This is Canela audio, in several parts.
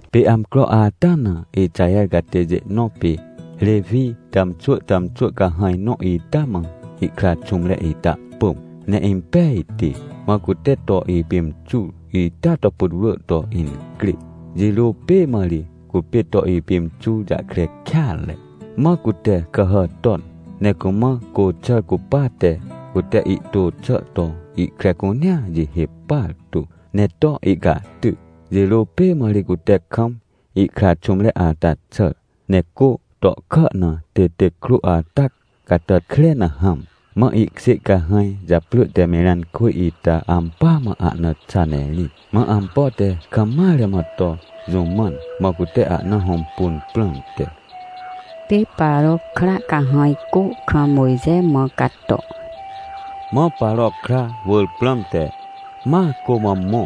Pê amcro ata na Ixaher catêjê nõ pê Rewi tàmxwỳ tàmxwỳ cahãj nõ ita mãihkra xũmre ita pỳm, ne impejti. Mã cute to ipimxur ita to putwrỳ toincrê. Jirô pê mã ri cupê to ipimxur jahkre kêatre, mã cute kàhà ton, ne cumã côxàr cupate, cute ihtô xà to ihkre cunea jihê partu, ne to ihcahty. Jirô pê mã ri cute kam ihkra xũmreata xàr, ne cô tohkà na têtêc krô ata catàt kre na hãm. Mã ihkjê cahãj japrỳ te Mirãnkwỳj ita ampỳa mã ahna xa ne irĩt, mã ampo te kam mare mã to jũ mãn, mã cute ahna hõmpun prãmte. Pê Paro kra cahãj cô kam Mojxe mã cato Mã Paro kra wỳr prãmte, ma cô mã mõ,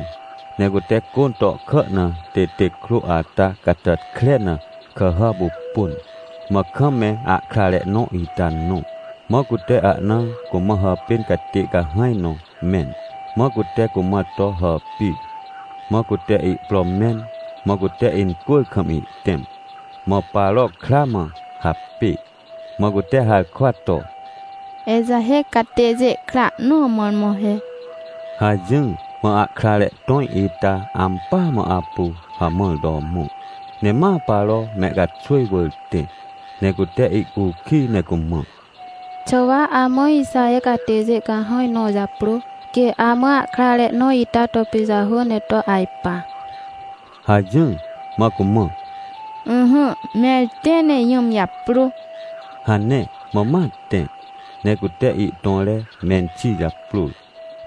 ne cute cô tohkà na têtêc krô ata catàt kre na kàhàpupun, mã kam me ahkrare nõ ita nõ. Mãcute ahna cumã hàpên catê cahãj nõ mẽn, mã cute cumã to hàpir. Mãcute ihpro mẽn, mã cute incwỳr kam ihtẽm. Mã Paro kra mã hapê, mã cute harkwa to: — Ixaher catêjê kra nõ mõrmõ he — hajỹr. Mã ahkrare tõj ita ampỳa mãapu hamãr to mõ, ne ma Paro mehcaxwỳj wỳr tẽ, ne cute ihcukij ne cumã: — Xà wa amã Ixaher catêjê cahãj nõ japrô, quê amã ahkrare nõ ita topijahô ne to ajpa? — hajỹr. Mã cumã: — Ỹhỹ, mẽr tẽ, ne jũm japrô — hane. Mã matẽ, ne cute ihtõre menxi japrôr,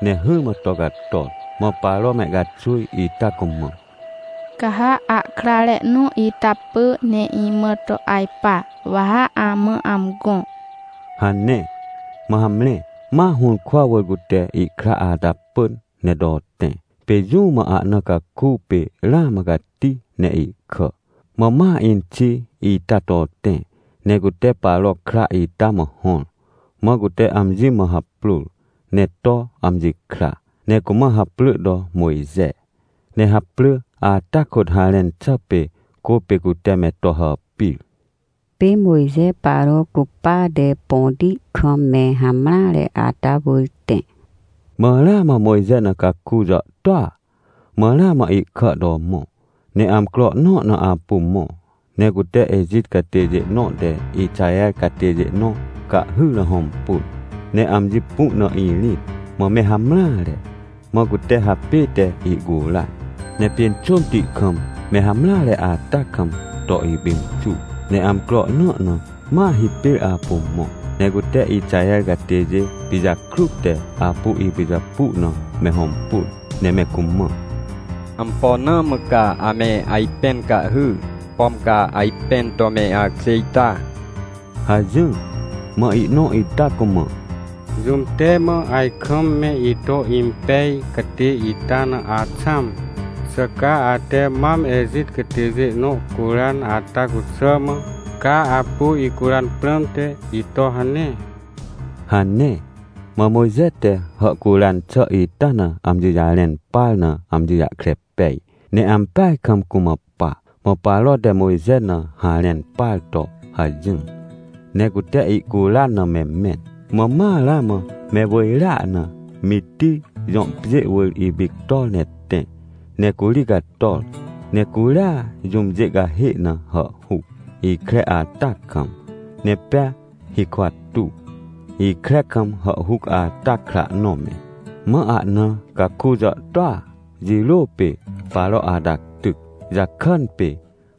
ne hỹrmã tocator. Mã Paro mehcaxwỳj ita cumã: — Ca ha ahkrare nõ ita pỳ ne imã to ajpa, wa ha amã amgõ — hane. Mãhamre, ma hũrkwa wỳr cute ihkra ata pỳn ne to tẽ. Pê jũ mã ahna cakupê ramã cati ne ihkà. Mã ma inxi ita to tẽ ne cute Paro kra ita mã hõr. Mã cute amji mãhaprôr, ne to amji kra, ne cumã haprỳ to Mojxe. Ne haprỳ ata kôt harẽn xàpê “Cô pê cute me to hàpir”. Pê Mojxe Paro cupate põti kam me hamreare ata wỳr tẽ Mã ramã Mojxe na caku jàhtôa, mã ramãihkà to mõ. Ne amcro nõ na apu mõ, ne cute Ejit catêjê nõ te Ixaher catêjê nõ cahhyr na hõmpun. Ne amji pu na irĩt mã me hamreare, mã cutehapête ihcuran, ne pjênxômti kam me hamreare atakam, to ipimxur. Ne amcro nõ na ma hipêr apu mõ, ne cuteIxaher catêjê pijakrut te apu ipijapu na me hõmpun, ne me cumã: — Ampo na mã ca ame ajpẽn cahhy, pom ca ajpẽn to me akjê ita? — hajỹr. Mã ihnõ ita cumã: — Jũm te mã ajkam me ito impej catê ita na axãm? Xà ca ate mam Ejitcatêjê nõ curan ata cuxàmã, ca apu icuran prãmte, ito hane? — hane. Mã Mojxe te hàhcuran xà ita na amjijarẽn par na amji jahkre pej, ne ampeaj kam cumã pa. Mã Paro te Mojxe na harẽn parto hajỹr, ne cute ihcuran na me mẽn. Mã ma ramãme wỳjrea na, Mitij jõ pjê wỳr ipictor ne tẽ. Ne curi cator, necuria jũmjê cahê na hàhhuc, ikre atakam, ne pea hikwa tuw, ikre kam hàhhuc ata kra nõ me. Mã ahna caku jàhtôa jirô pê Paro ata tyc jakàn pê,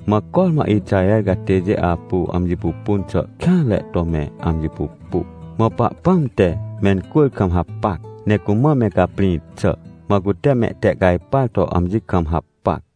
mã cormã Ixaher catêjê apu amji pupun xà kêanre to me amji pupu. Mã Pahpãm te mencwỳr kam hapac, ne cumã me caprĩ xà. Mã cutemehtehcajpar to amji kam hapac.